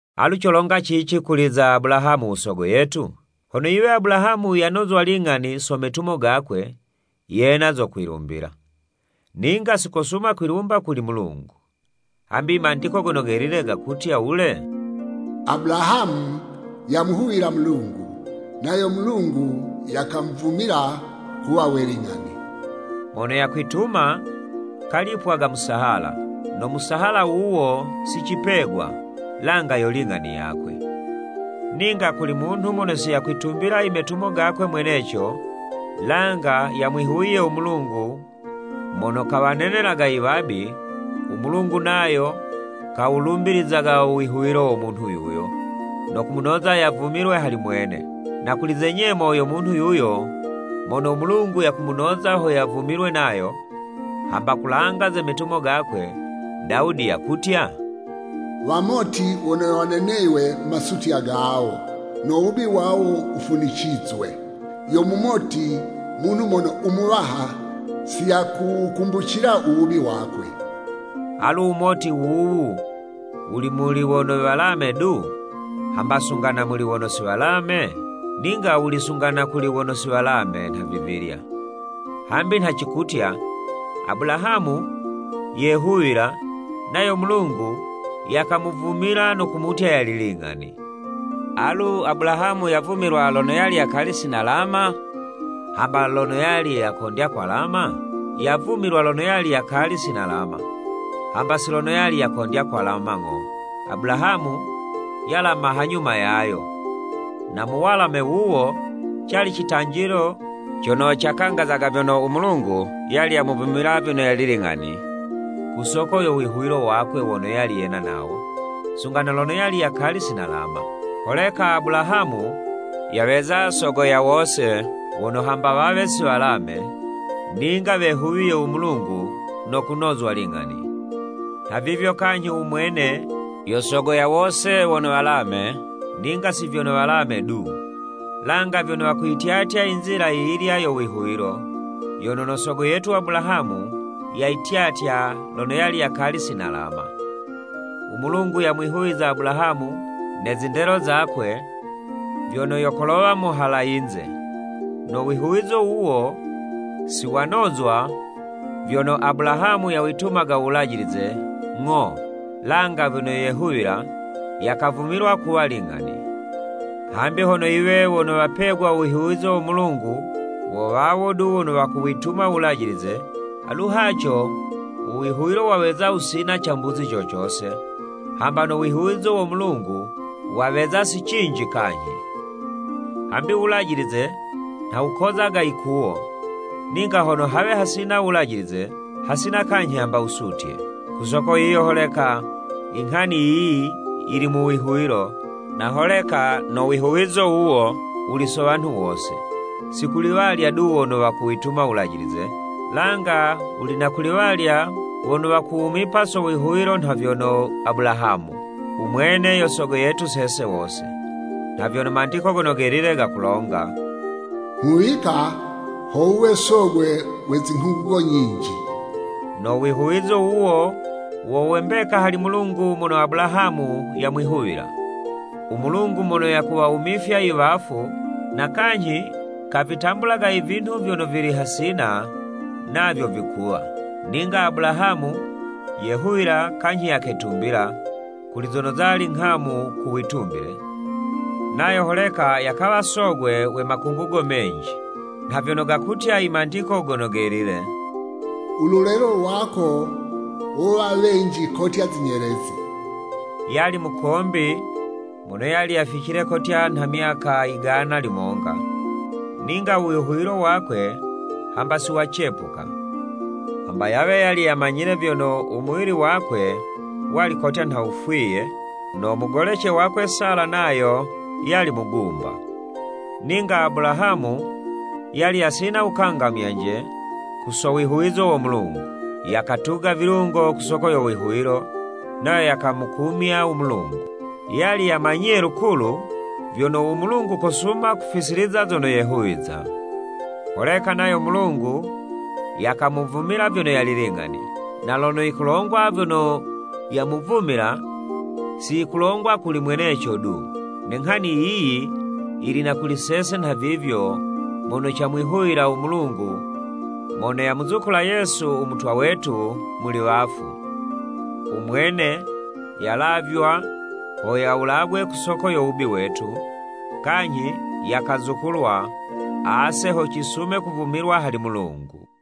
Alu colonga cici kuli za Abulahamu u sogo yetu? Hono yiwe Abulahamu yanozwa ling'ani so metumo gakwe, yena zo kwilumbila. Ninga si kosuma kwilumba kuli Mulungu. Hambi i Mandiko Gono Gelile gakutya wule? “Abulahamu yamwihuwila Mulungu, Nayo Mulungu yakamuvumila kuwa we ling'ani.” Mono yakwituma, kalipwaga musahala, no musahala wuwo si cipegwa, langa yo ling'ani yakwe. Ninga kuli munhu mono si yakwitumbila imetumo gakwe mweneco, langa yamwihuwiye u Mulungu mono kawanenelaga iwabi, u Mulungu nayo kawulumbilizaga u wihuwilo wo munhu yuyo, no kumunoza yavumilwe hali mwene. Na kuli ze nyemo yo munhu yuyo, mono u Mulungu yakumunoza ho yavumilwe nayo, hamba kulanga ze metumo gakwe, Dawudi yakutya, “Wamoti wono waneneywe masutya gawo no wubi wawo wufunicizwe. Yo mumoti munhu mono u Muwaha si yakuwukumbucila u wubi wakwe.” Alu wumoti wuwu wuli muli wono walame du, hamba sunga na muli wono si walame? Ninga wuli sunga na kuli wono si walame nhavivilya. Hambi nha cikutya, “Abulahamu yehuwila, nayo u Mulungu yakamuvumila no kumutya yali ling'ani.” Alu Abulahamu yavumilwa lono yali yakali si nalama, hamba lono yali yakondya kwalama? Yavumilwa lono yali yakali si nalama, hamba si lono yali yakondya kwalama ng'o. Abulahamu yalama hanyuma yayo, na mu walame wuwo, cali citanjilo cono cakangazaga vyono, u Mulungu yali yamuvumila vyono yali ling'ani, ku soko yo wihuwilo wakwe wono yali yena nawo, sunga na lono yali yakali si nalama. Holeka Abulahamu yaweza sogo wa wose wono, hamba wawe si walame, ninga wamwihuwiye u Mulungu no kunozwa ling'ani. Nhavivyo kanyhi u mwene, yo sogo wa wose wono walame, ninga si vyono walame du, langa vyono wakuyityatya inzila yiyilya yo wihuwilo, yono no Sogo yetu Abulahamu yayityatya lono yali yakali si nalama. U Mulungu yamwihuwiza Abulahamu ne zindelo zakwe, vyono yo kolowa muhala yinze. No wihuwizo wuwo, si wanozwa vyono Abulahamu yawitumaga u Wulajilize, ng'o, langa vyono yehuwila, yakavumilwa kuwa ling'ani. Hambi hono yiwe wono wopegwa u wihuwizo wo Mulungu wo wawo du wono wakuwituma u Wulajilize, alu haco u wihuwilo waweza wusina cambuzi co cose, hamba no wihuwizo wo Mulungu, waweza si cinji kanyhi. Hambi u Wulajilize nha wukozaga yikuwo, ninga hono hawe hasina u Wulajilize, hasina kanyhi hamba wusutye. Ku soko yiyo holeka, inghani yiyi yili mu wihuwilo, na holeka no wihuwizo wuwo wuli so wanhu wose, si kuli walya du wono wakuwituma Wulajilize, langa wuli na kuli walya wono wakuwumipa so wihuwilo nha vyono Abulahamu. U mwene yo sogo yetu sese wose. Nha vyono Mandiko Gono Gelile gakulonga, “Nghuwika ho wuwe sogwe we zinghungugo nyinji.” No wihuwizo wuwo wo we mbeka hali Mulungu mono Abulahamu yamwihuwila. U Mulungu mono yakuwawumifya i wafu, na kanyhi kavitambulaga i vinhu vyono vili hasina, navyo vikuwa. Ninga Abulahamu yehuwila kanyhi yaketumbila, kuli zono zali nghamu ku witumbile, nayo holeka yakawa sogwe we makungugo menji, nha vyono gakutya i Mandiko Gono Gelile, “U lulelo lwako, wowa wenji kotya zinyelezi.” Yali mukombi mono yali yaficile kotya nha myaka yigana limonga, ninga u wihuwilo wakwe hamba si wacepuka, hamba yawe yali yamanyile vyono, u muwili wakwe wali kotya nha wufwiye, no mugolece wakwe Sala nayo yali mugumba. Ninga Abulahamu yali yasina wukangamyanje ku so wihuwizo wo Mulungu, yakatuga vilungo ku soko yo wihuwilo, nayo yakamukumya u Mulungu. Yali yamanyiye lukulu vyono, u Mulungu kosuma kuzifisiliza zono yehuwiza. Holeka nayo Mulungu yakamuvumila vyono yali ling'ani. Na lono yikulongwa vyono “Yamuvumila,” si yikulongwa kuli mweneco du. Ne nghani yiyi yili na kuli sese nhavivyo mono camwihuwila u Mulungu mono yamuzukula Yesu, u Mutwa wetu, muli wafu. U mwene yalavywa ho yawulagwe ku soko yo wubi wetu, kanyhi yakazukulwa, ase ho cisume kuvumilwa hali Mulungu.